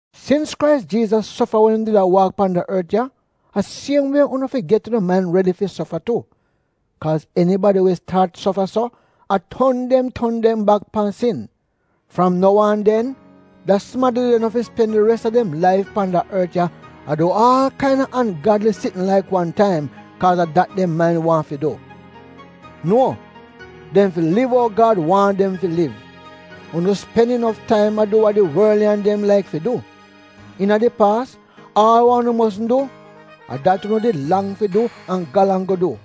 Sins Krais Jiizas sofa wen im did a waak pan da ort ya, a siem wie unu fi get unu main redi fi sofa tu. Kaaz enibadi we staat sofa so, a ton dem ton dem bak pan sin. Fram nou aan den, da sumadi de no fi spen di res a dem laif pan da ort ya a du aal kain-a sitn we no av notn fi du wid Gad laka wan taim, kaaz a dat dem mait-a waahn fi du. Nuo, dem fi liv ou Gad waahn dem fi liv. Unu spen inof taim a du wa di worliyan dem laik fi du. Iina di paas aal wa unu mosn du — a dat unu did lang fi du an galang go du.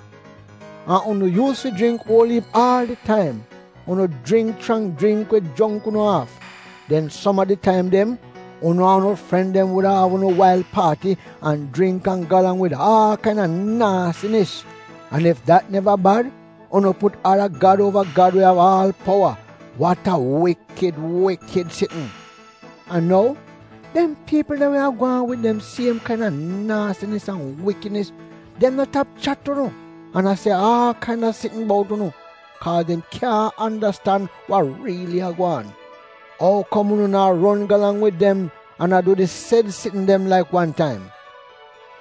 An unu yuus fi jringk uol iip aal di taim. Unu jringk chrang jringk we jongk unu aaf. Den som a di taim dem, unu an unu fren dem wuda av unu wail paati an jringk an galang wid aal kain-a naasinis. An ef dat neva bad, unu put ada gad uova Gad we av aal powa — wat a wikid wikid sitn! An nou, dem piipl de we a gwaan wid di siem kain-a naasinis an wikidnis, dem no tap chat unu, an a se aal kain-a sitn bout unu, kaaz dem kyaahn andastan wa riili a gwaan. Ou kom unu naa ron galang wid dem, an a du di sed sitn dem laik wan taim?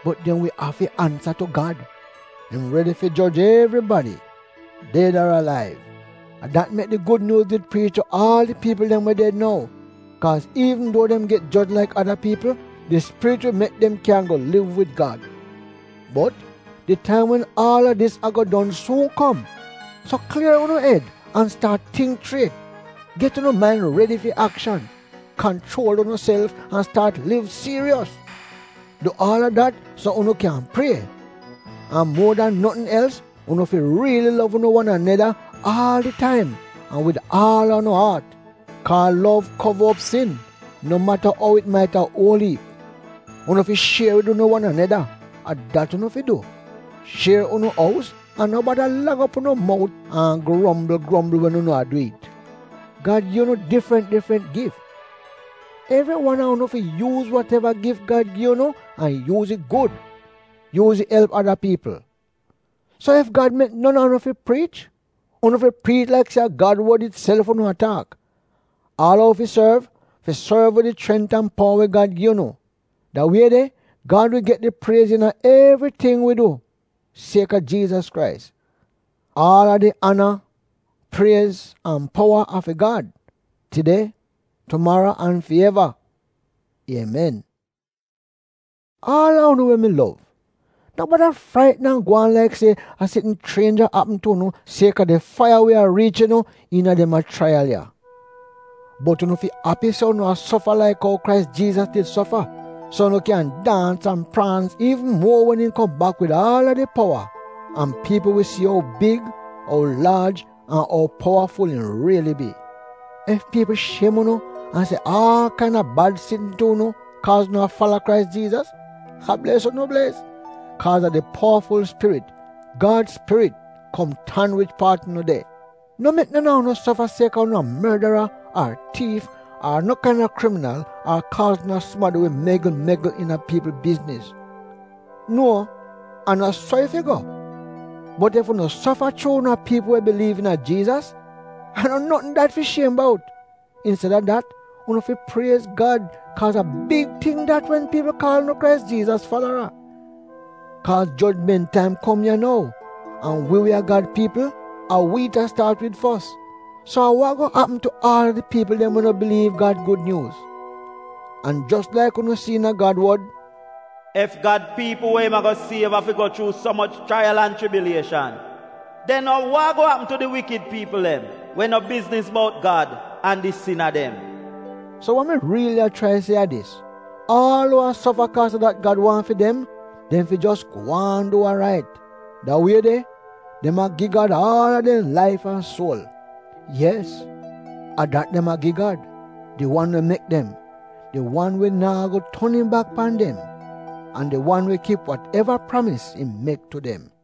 Bot dem wi afi ansa tu Gad. Im redi fi joj evribadi — ded ar alaiv. A dat mek di Gud Nyuuz did priich tu aal di piipl dem we ded nou, kaaz iivn duo dem get joj laik ada piipl, di Spirit wi mek dem kyan go liv wid Gad. Bot, di taim wen aal a dis a-go don suun kom. So klier unu ed an staat tingk chriet, get unu main redi fi akshan, kanchuol unuself an staat liv siiros. Du aal a dat so dat unu kyan prie. An muo dan notn els unu fi riili lov unu wan aneda aal di taim an wid aal a unu aat. Kaa lov kova op sin, no mata ou it mait-a uol iip. Unu fi shier wid unu wan aneda — a dat unu fi du. Shier unu ous an no bada lang op unu mout an grombl grombl wen unu a du it. Gad gi unu difrant difrant gif. Evri wan a unu fi yuuz wat-eva gif Gad gi unu, an yuuz it gud. Yuuz it elp ada piipl. So ef Gad mek non a unu fi priich — unu fi priich laik se a Gad wod itself unu a taak. Aal a uu fi sorv, fi sorv wid di chrent an powa we Gad gi unu. Da wie de Gad wi get di priez iina evriting wi du siek-a Jiizas Krais. Aal a di ana, priez an powa a fi Gad, tide, tumaro an fi eva! Iemen. Aal a unu we mi lov, no bada fraitn an gwaan laik se a sitn chrienj a apm tu unu siek-a di faiya we a riich unu iina dem ya chraiyal ya. Bot unu fi api se unu a sofa laik ou Krais Jiizas did sofa, so unu kyan daans an praans iivn muo wen im kom bak wid aal a di powa, an piipl si ou big, ou laaj an ou powaful im riili bi! Ef piipl shiem unu, an se aal kain-a bad sitn tu unu kaa unu a fala Krais Jiizas — a bles unu bles. Kaaz a di powaful Spirit — Gad Spirit, kom tan wich paat unu de. No mek non a unu sofa siek-a unu a mordara, ar tiif, ar no kain-a kriminal, ar kaaz unu a sumadi we megl-megl iina piipl bizniz. Nuo, a no so it fi go. Bot ef unu sofa chuu unu a piipl we biliiv iina Jiizas — a no notn dat fi shiem bout. Insted-a dat, unu fi priez Gad kaaz a big ting dat wen piipl a kaal unu Krais Jiizas falara. Kaaz jojment taim kom ya nou; an wi we a Gad piipl, a wi it a staat wid fos. So, a wa a-go apm tu aal a di piipl dem we no biliiv Gad Gud Nyuuz? An jos laik unu si iina Gad wod, “Ef Gad piipl we im a-go siev afi go chuu so moch chraiyal an chibilieshan, den a wa a-go apm tu di wikid piipl dem we no bizniz bout Gad an di sina dem?” So wa mi riili a chrai se a dis: aal uu a sofa kaaz a dat Gad waahn fi dem, dem fi jos gwaan du wa rait. Da wie de, dem a gi Gad aal a dem laif an suol. Yes, a dat dem a gi Gad — di wan we mek dem. Di wan we naa go ton im bak pan dem. An di wan we kip wat-eva pramis im mek tu dem.